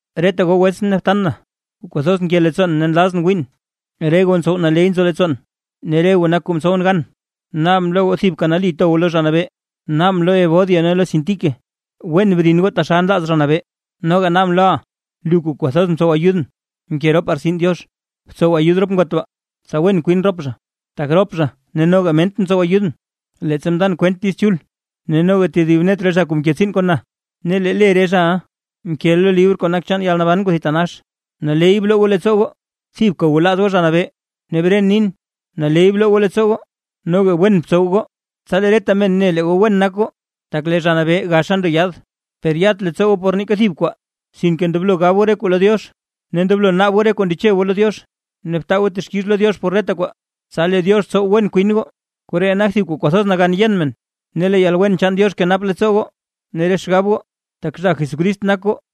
Reta goo wetsʼn ne btan na, kuu kwathoz nke leettsoon ne nlazʼn wiin, re goo ntsow naley nzo leettsoon, ne re goo nak kuu mtsowʼn gan, naabʼn lo goo thibka nali to goo lo Zha Nabee. Naabʼn lo Evodia ne lo Síntique wen brin goo taxal nlaaz Zha Nabee. Noga naabʼn loʼa, lu kuu kwathoz mtsow ayudʼn mke ropaa rtsin Diox, btsow ayud rop ngot baa, tsa wen kwin rop zha, tak rop zha ne noga Ment mtsow ayudʼn, leettsa mndan kwent Diiz Chul, ne noga tedib net re zha mke tsiin kon na. Ne lee le re zhaʼa nkeʼa lo libr kuu nak chaan yalnaban kuu thitanax. Naley bloo goo leettsoo goo, thibka gwalaaz goo Zha Nabee, ne bren nin: ¡Naley bloo goo leettsoo goo! Noga wen btsow goo, tsa lee reta men ne lee goo wen nak goo, tak lee Zha Nabee gaxa ndo yaad. Per yat leettsoo goo por neeka thib kwaa, sinke ndoblo gab goo re kuu lo Diox, ne ndoblo naab goo re kuu ndeche goo lo Diox, ne btaa goo texkix lo Diox por reta kwaa. Tsa lee Diox tsow wen kwin goo, koree nak thib kuu kwathoz nagan yen men. Ne lee yalwen chaan Diox kenap leettsoo goo ne re xgab goo, tak zha Jesucrist nak goo.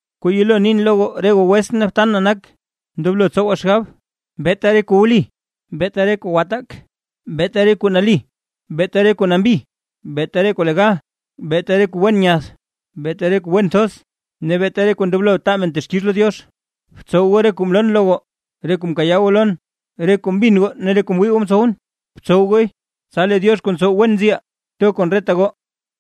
Kuu yelo nin lo re goo wetsʼn ne btan na nak, ndoblo tsowaa xgab: beeta re kuu wli, beeta re kuu gwataak, beeta re kuu nali, beeta re kuu nambi, beeta re kuu legal, beeta re kuu wen nyath, beeta re kuu wen thoz, ne beeta re kuu ndoblo taa men texkix lo Diox. Btsow goo re kuu mloon lo goo, re kuu mkayaa goo lon, re kuu mbin goo mnin ne re kuu mwii goo mtsowʼn. Btsow gooy, tsa lee Diox kuu ntsow wen nziʼaa to kon reta goo.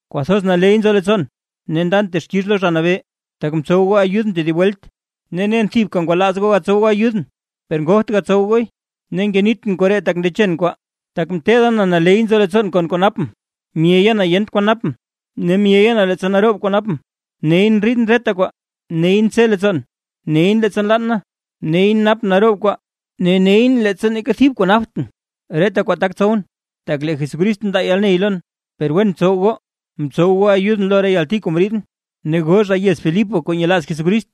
Kwathoz naley nzo leettsoon, ne ndan texkix lo Zha Nabee, tak mtsow goo ayudʼn tedib welt, ne nen thibka ngwalaaz goo gatsow goo ayudʼn, per ngogt gatsow gooy. Ne ngenitʼn koree tak ndechen kwaa; tak mteeda na naley nzo leettsoon kon kuu napʼn. Myeya na yent kwan napʼn ne myeya na leettsa naroob kwaa napʼn. Neyʼn ndriidʼn reta kwaa, nyeyʼn tse leettsoon, nyeyʼn leettsa nlann na, nyeyʼn napʼn naroob kwaa ne nyeyʼn leettsa neeka thib kwaa naptʼn. Reta kwaa tak tsowʼn, tak lee Jesucrist ndaa yalney lon. Per wen mtsow goo, mtsow goo ayudʼn lo re yalti kuu mriidʼn. Ne goo zha yez Filipo kuu nyelaaz Jesucrist,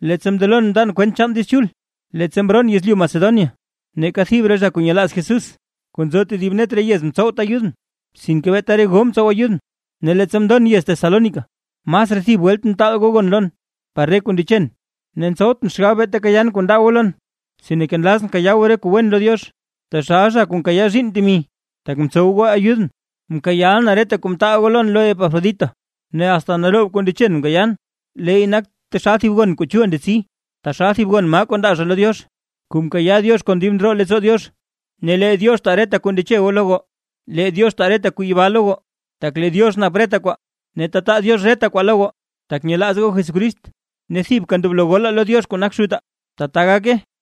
leettsa mndelon mndan kwent chaan Diiz Chul, leettsa mroon yezlyu Macedonia, neeka thib re zha kuu nyelaaz Jesús kuu nzo tedib net re yez mtsowt ayudʼn, sinke beeta re goo mtsow ayudʼn. Ne leettsa mndon yez Tesalónica, masraa thib welt mtaal goo gon lon par re kuu ndechen. Ne ntsowtʼn xgab beeta kayaan kuu ndaa goo lon, sinke nlazʼn kayaa goo re kuu wen lo Diox, taxal zha kuu nkayaa zhiinn temi, tak mtsow goo ayudʼn. Mkayaaʼa na reta kuu mtaal goo lon lo Epafrodito, ne asta naroob kuu ndechen mkayaan. Leey nak taxal thib gon kuu chul ndetsi, taxal thib maa gon kuu ndaa zha lo Diox, kuu nkayaa Diox kon dib ndroo leettsoo Diox. Ne lee Diox taa reta kuu ndeche goo lo goo. Lee Diox taa re kuu yibaa lo goo, tak lee Diox nap reta kwaa, ne tetaa Diox re kwaa lo goo tak nyelaaz goo Jesucrist. Ne thibka ndoblo golaa lo Diox kuu nak Xutaa. ¡Tata gake!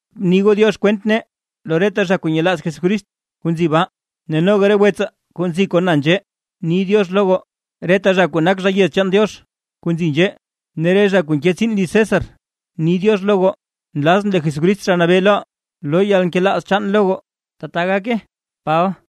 Bni goo “diox” kwent nee lo reta zha kuu nyelaaz Jesucrist kuu nzi baa. Ne noga re wetsaa kuu nzi kon na nzhee ni “diox” lo goo. Reta zha kuu nak zha yez chaan Diox kuu nzi nzhee ne re zha kuu nke tsiin liz César, ni “diox” lo goo. Nlazʼn lee Jesucrist, Zha Nabee loʼaa, loo yalnkelaaz chaan lo goo. ¡Tbaa gake! Paba